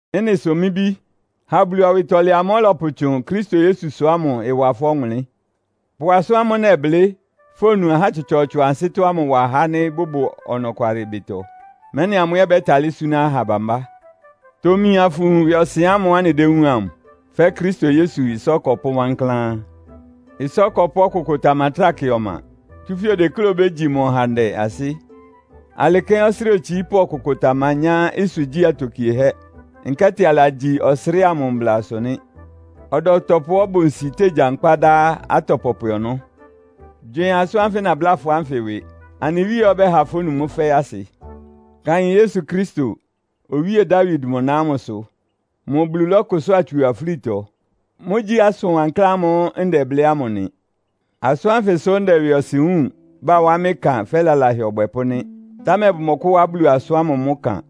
Ɩ́nɩ sʋ mɩ́ bí, ha Bulu awɩtɔlɛ amʋ́ʋ́ ɔlɔpʋtsʋn Kristo Yesusʋ ámʋ ɩwa fʋ́ ɔwʋnlɩ́n. Pʋ asʋ́n ámʋ́ʋ́ nɛblɩ́, fonu ahá tsɔtsɔɔtsɔ ansɩ́tɔ́ ámʋ wa ahá ánɩ́ bʋbʋ ɔnɔkwalɩ ɩbɩtɔ, mɛ́nɩ amʋ́ ɛ́ bɛ́talɩ́ súná aha bambá. Tomi afʋwun ɩwɩɔsɩn ámʋ́ʋ́ anɩdéwúun amʋ, fɛ́ Kristo Yesu ɩsá ɔkɔpʋ́ wankláán. Ɩsá ɔkɔpʋ́ ɔkʋkʋ tamatráa kɩ ɔma, tsúfɛ́ odekléá obégyi mʋ ɔhandɛ ansɩ́. Alɩ kɛ́n ɔsrɩ́ɩ otsiípʋ́ ɔkʋkʋ tamanyá ɩsʋgyí atokiehɛ́, nkɛ́tɩ alagyi ɔsrɩ́ɩ amʋ mblasʋ nɩ́. Ɔdɔtɔpʋá ɔbʋ nsi tégyankpá dá atɔ pɔpwɛ ɔnɔ́. Gywɩɩn asʋ́n ánfɩ nabláa fʋ́ ánfɩ ɩwɩ. Anɩ Wíe ɛ́ ɔbɛ́ha fónu mʋ́ fɛ́ɛ́ asɩ. Kaɩn Yesu Kristo, Owíe Dawid mʋ na ámʋsʋ. Mʋ Bulu lɔ́kʋsʋ́a tsu afúlitɔ. Mʋ́gyí asʋn wankláán ámʋ́ʋ́ ndɛblɩ́ ámʋ nɩ. Asʋ́n ánfɩ sʋ́ ndɛ ɩwɩɔsɩn wúun, bawá mɩ́ ɩkan fɛ́ lalahɛ ɔbwɛpʋ́ nɩ́. Támɛ bʋmɔkʋ́wá Bulu asʋ́n ámʋ mʋ́ ɩkan.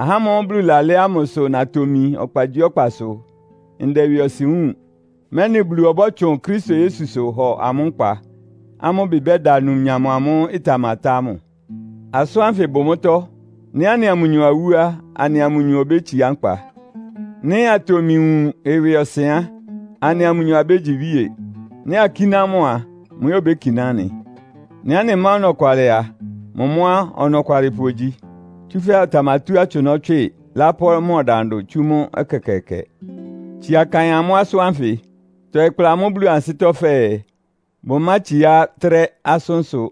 Ahá ámʋ́ʋ́ Bulu lalɛ́ ámʋ sʋ natomi ɔkpagyíɔkpasʋ ndɛ ɩwɩɔsɩn wúun, mɛ́nɩ Bulu ɔbɔ́tsʋn Kristo Yesusʋ hɔ amʋ́ nkpa, amʋ́ ɩbɩ bɛ́da numnyam amʋ́ʋ́ ɩtamatá ámʋ. Asʋ́n ánfɩ bʋ mʋ́tɔ́. “Nɩ́ anɩa mʋnyɔ awú á, anɩa mʋnyɔ obétsiá nkpa. Nɩ́ atomi wun ɩwɩɔsɩn á, anɩa mʋnyɔ abégyi iwíe. Nɩ́ akíná mʋ a, mʋ ɛ́ obékiná anɩ. Nɩ́ anɩmá ɔnɔkwalɩ a, mʋ mʋ́ á, ɔnɔkwalɩpʋ ogyi, tsúfɛ́ ɔtamatú atsʋnɔ́ tswɩ, lápʋ́ mʋ ɔdandʋ tsú mʋ́ ɛkɛkɛɛkɛ.” Tsia kaɩn amʋ́ asʋ́n ánfɩ. Tɔɩ kpla amʋ́ Bulu ansɩ́tɔ́ fɛɛ, bʋmátsiá trɛ́ asʋ́nsʋ́.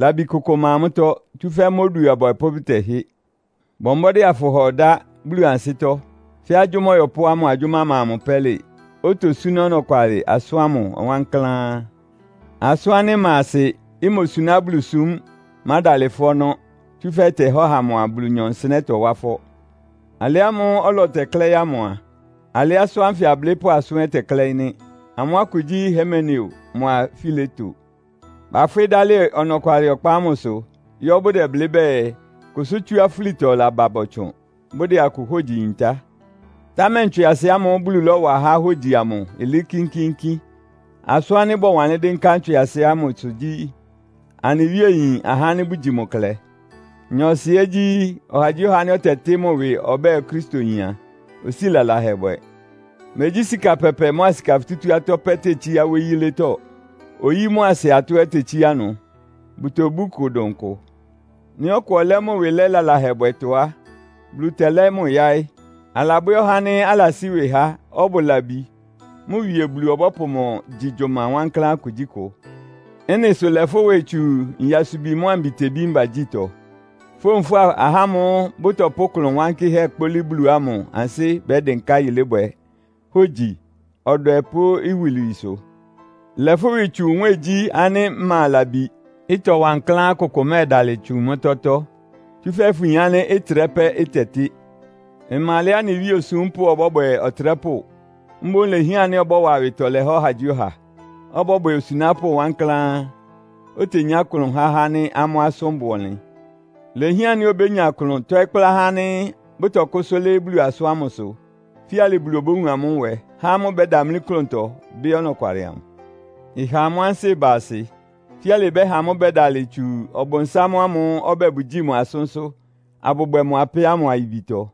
Labi kʋkʋ ɩma mʋ́tɔ́, tsúfɛ́ mʋ́ odu abwɛpʋ́ bʋtɛhɩ́. Bɔ mbɔ́dɩ́ afʋhɔ ɩdá Bulu ansɩ́tɔ́, fɛ́ agyʋ́má ɔyɔpʋ́á mʋ agyʋ́má ma mʋ pɛ́lɩ, otosúná ɔnɔkwalɩ asʋ́n ámʋ wankláán. Asʋ́n ánɩ́ ɩma asɩ, imosuná Bulusúm mádalɩ fʋ́ ɔnɔ́, tsúfɛ́ ɩtɛhá ɔha mʋa Bulunyɔ nsɩnɛ́ tɔwá ɩfɔ́. Alɩ ámʋ́ʋ́ ɔlɔ tɛklɛ́ɩ́ ámʋ a, alɩ́ asʋ́n ánfɩ ablɩ́pʋ́ asʋ́n ɛ́ tɛklɛ́ɩ́ nɩ́. Amʋ́ akʋ gyí Himeneo mʋa Fileto. Bafwɩ́ dalɩ ɔnɔkwalɩ ɔkpa ámʋsʋ yɔ́ bʋdɛblɩ́ bɛɛ, kʋsʋ́ tsú afúlitɔ laba bɔtsʋn, bʋdɛ akʋ hógyi yintá. Támɛ ntswɩasɩ ámʋ́ʋ́ Bulu lɔ́wa há hógyi amʋ ɩlɩɩ́ kínkíínkín. Asʋ́n ánɩ́ bɔwanlɩ́n dɩ́nká ntswɩasɩ ámʋsʋ gyí, “Anɩ Wíe yin ahá ánɩ́ bʋgyi mʋ klɛ.” Nyɔɔsɩ ɛ́ gyí, “Ɔhagyíɔha ánɩ́ ɔtɛtɩ́ mʋ ɩwɩ ɔbɛ́ɛ Okristoyin a, osíi lalahɛ bwɛ.” Megyí sika pɛpɛ mʋ́a sika futútú atɔ́ pɛ́ tetsíá wóyí yílétɔ́. Oyí mʋ́a ɩsɩ atɔ́ ɛ́ tetsíá ɩnʋ. Bʋtobú ɩkʋ dʋn kʋ. Nɩ́ ɔkʋ ɔlɛ́ mʋ ɩwɩ lɛ́ lalahɛbwɛtɔ á, Bulu tɛlɛ́ mʋ́ yáɩ́. Alabwɛ́ ɔhá ánɩ́ alasí ɩwɩ há, ɔbʋ labi, mʋ Wie Bulu ɔbɔ́pʋ mʋ gyi gyʋma wankláán kugyíkʋ. Ɩ́nɩ sʋ lɛ fʋ́ ɩwɩ tsu nyasubi mʋ́a mbitebí mbagyítɔ. Fówun fʋ́a ahá ámʋ́ʋ́ bʋtɔpʋ́ ɩklʋn wankɩ́hɛ́ kpólí Bulu ámʋ ansɩ́ bɛ́dɩnká yilébwɛ, hógyi, ɔdwɛ pʋ́ iwilwiisʋ. Lɛ fʋ́ ɩwɩ tsu nwɛ́ɛngyí ánɩ́ ɩma labi, ɩtɔ wankláán kʋkʋ mɛ́ɛdalɩ tsu mʋ́tɔ́tɔ́, tsúfɛ́ fʋyin ánɩ́ ɩtrɛ́ pɛ́ ɩtɛtɩ́. Ɩma alɛá anɩ Wíe osúmpʋ́ ɔbɔ́bwɛ ɔtrɛ́pʋ́. Mboún ilehián ánɩ́ ɔbɔ́wa awɩtɔlɛ há ɔhagyíɔha, ɔbɔ́bwɛ osunápʋ́ wankláán, otenyá klʋn há ahá ánɩ́ amʋ́ asʋ́n bʋ ɔnlɩn. Ilehián ánɩ́ obénya klʋn tɔ́ɩ́ kplá ahá ánɩ́ bʋtɔkʋ́sʋ́ lɩ́ɩ́ Bulu asʋ́n ámʋsʋ. Fíalɩ Bulu obówun amʋ́ nwɛ, há amʋ́ bɛ́damlí klʋntɔ, bɩ́ ɔnɔkwalɩ amʋ, ɩha amʋ́ ansɩ́ ɩba asɩ. Fíalɩ ɩbɛ́ha amʋ́ bɛ́dalɩ tsu Ɔbʋnsám amʋ́ʋ́ ɔbɛ́ɛ bʋgyíi mʋ asʋ́nsʋ́, abʋbwɛ mʋ apɛ́ ámʋ ayibitɔ.